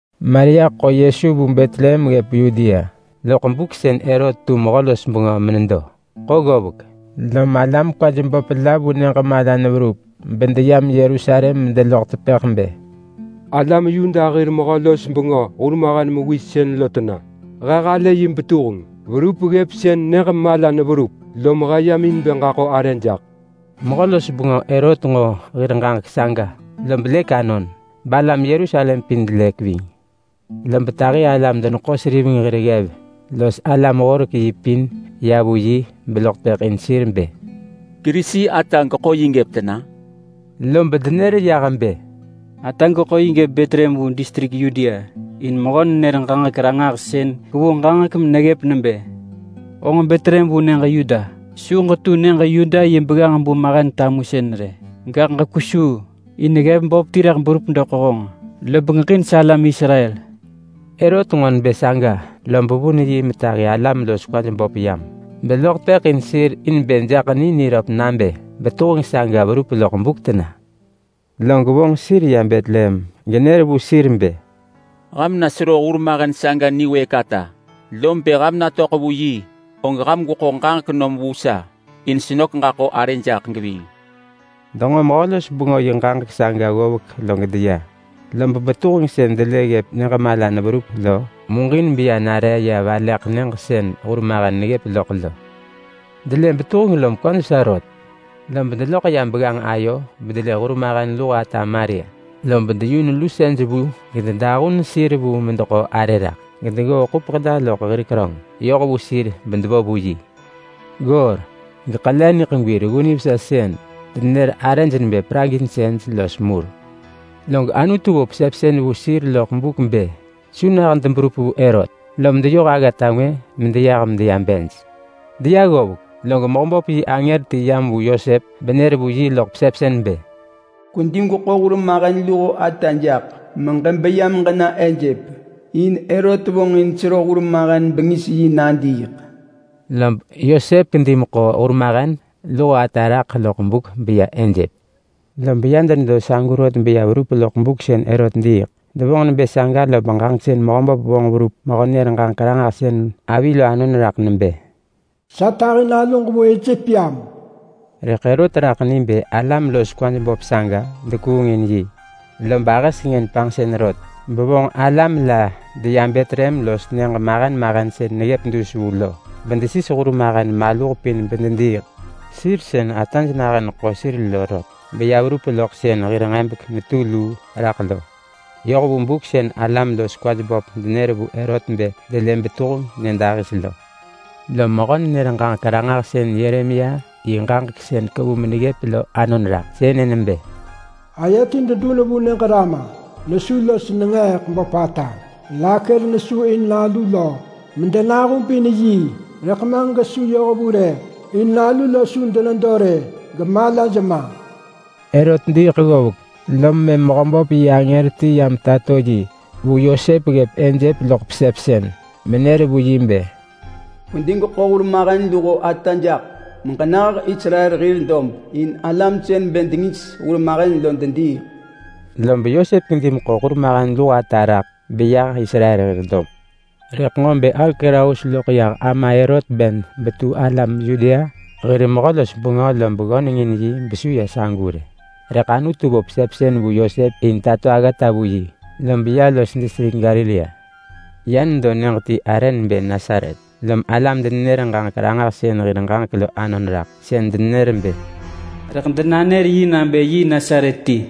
Maria ḳo Yesu vu Betlehem ggëp Yudea loḳ buk sën Herot tu mehö-los-bengö menedo. Ḳo ggovek, lom alam kwaj böp la vu nyëġ mala neverup bedeyam Yerusalem medeloḳ tepëḳ bë, “Alam Yuda hir mehö-los-bengö hurmahen mewis sën lo tena? He halë yi betuheng verup ggëp sën nyëġ mala neverup, lom he yam in bë ġaḳo arë jaḳ.” Mehö-los-bengö Herot nġo hir ġaġek saga, lob lëk anon, balam Yerusalem pin delëk ving. Lob tahi alam-deneḳo-seriveng hir ggev los alam-horek-yi pin ya vu yi beloḳ tepëḳ in sir bë, “Kerisi ata geḳo yi gëp tena?” Lob denër yah bë, “Ata geḳo yi gëp Betlehem vu distrik Yudea, in mehö-nenër-ġaġek-ranġahsën kevu ġaġek meneggëp nebë: ‘Honġ Betlehem vu nyëġ Yuda, su ġetu nyëġ Yuda yi begganġ-bu mahen tamusën rë, gaḳ ġekwesuu. In ggev böp ti rëḳ berup doḳ honġ, lob ġeġin salam Israel.’” Herot nġo nebë saga lob vun yi metahi alam los kwaj böp saga yam, beloḳ tepëḳ in sir in bë jaḳ ni niröp nabë betuheng saga verup loḳ buk tena. Log vonġ sir ya Betlehem genër vu sir bë, “Ham na sero hurmahen saga niwëëk ata, lob bë ham natöḳ vu yi, og ham gweḳo ġaġek nom vu sa, in senök ġaḳo arë jaḳ geving.” Denġo mehö-los-bengö yi ġaġek saga ggovek log deya. Lob betuheng sën delë neggëp nyëġ mala neverup lo, muġin beya nare ya valeḳ nyëġ sën hurmahen neggëp loḳ lo. Delë betuheng lom kwaj vesa rot. Lob deloḳ ya begganġ ayo bedelë hurmahen luho ata Maria, lob deyun lusej vu los deḳo yi raḳ. Gedeggoo ḳupeḳ la loḳ hir keröng yoh vu sir bedevo vu yi. Goor, geḳele niḳegwi reggu nivesa sën denenër arëj nebë praginsëj los mur. Log Anutu vo pesepsën vu sir loḳ buk bë su nah deberup vu Herot, lom deyoh aggata ngwë medeyah medeya bej. Deya ggovek, log Mehöböp yi angër ti yam vu Yosep benër vu yi loḳ pesepsën bë, “Kwedi gweḳo hurmahen luho ata jaḳ, meġebeya meġena Ejep. In Herot vonġin sero hurmahen bengis yi nadiiḳ.” Lob Yosep kedi meḳo hurmahen luho ata raḳ loḳ buk beya Ejep. Lob ya denedo sagu rot beya verup loḳ buk sën Herot diiḳ. Devonġ nebë saga lob ġaġek sën Mehöböp vonġ verup mehö-nenër-ġaġek-ranġahsën avi lo anon raḳ nebë: “Sa tahi naluġ vu Ejep yam.” Rëḳ Herot raḳ ni bë alam los kwaj böp saga dekuung in yi, lob ahë sengën panġsën rot, bevonġ alam la deya Betlehem los nyëġ mahen mahen sën neggëp dus vu lo, bedesis hurmahen maluh pin bedediiḳ. Sir sën ataj nahën neḳo sir lo rot, beya verup loḳ sën hir nġebek netu luu raḳ lo, yoh vu buk sën alam los kwaj böp denër vu Herot bë delë betuheng nyëdahis lo. Lom mehö-nenër-ġaġek-ranġahsën Yeremia yi ġaġek sën kevu meneggëp lo anon raḳ. Sënë nebë: “Aye ti dedun vu nyëġ Rama. Nesu los nenġeeḳ böpata. Rakel nesu in nalu lo, medenahubin yi, rëḳ ma gesu yoh vu rë. In nalu lo su denedo rë, gaḳ malaj ma.” Herot diiḳ ggovek, lom mëm Mehöböp yi angër ti yam tato yi vu Yosep ggëp Ejep loḳ pesepsën, menër vu yi bë, “Kwedi gweḳo hurmahen luho ata jaḳ meġenah Israel hir dob. In alam sën bë dengis hurmahen lo dediiḳ.” Lob Yosep kedi meḳo hurmahen luho ata raḳ, beyah Israel hir dob. Rëḳ nġo bë Arkelaus loḳ yah ama Herot ben betu alam Yudea hir mehö-los-bengö lob ggöneng in yi besu ya sagu rë. Rëḳ Anutu vo pesepsën vu Yosep in tato aggata vu yi, lob ya los distrik Galilea. Ya nedo nyëġ ti arë nebë Nasaret. Lom alam-denenër-ġaġek-ranġahsën hir ġaġek lo anon raḳ. Sën denër bë: “Rëḳ denanër yi nabë yi Nasaret ti.”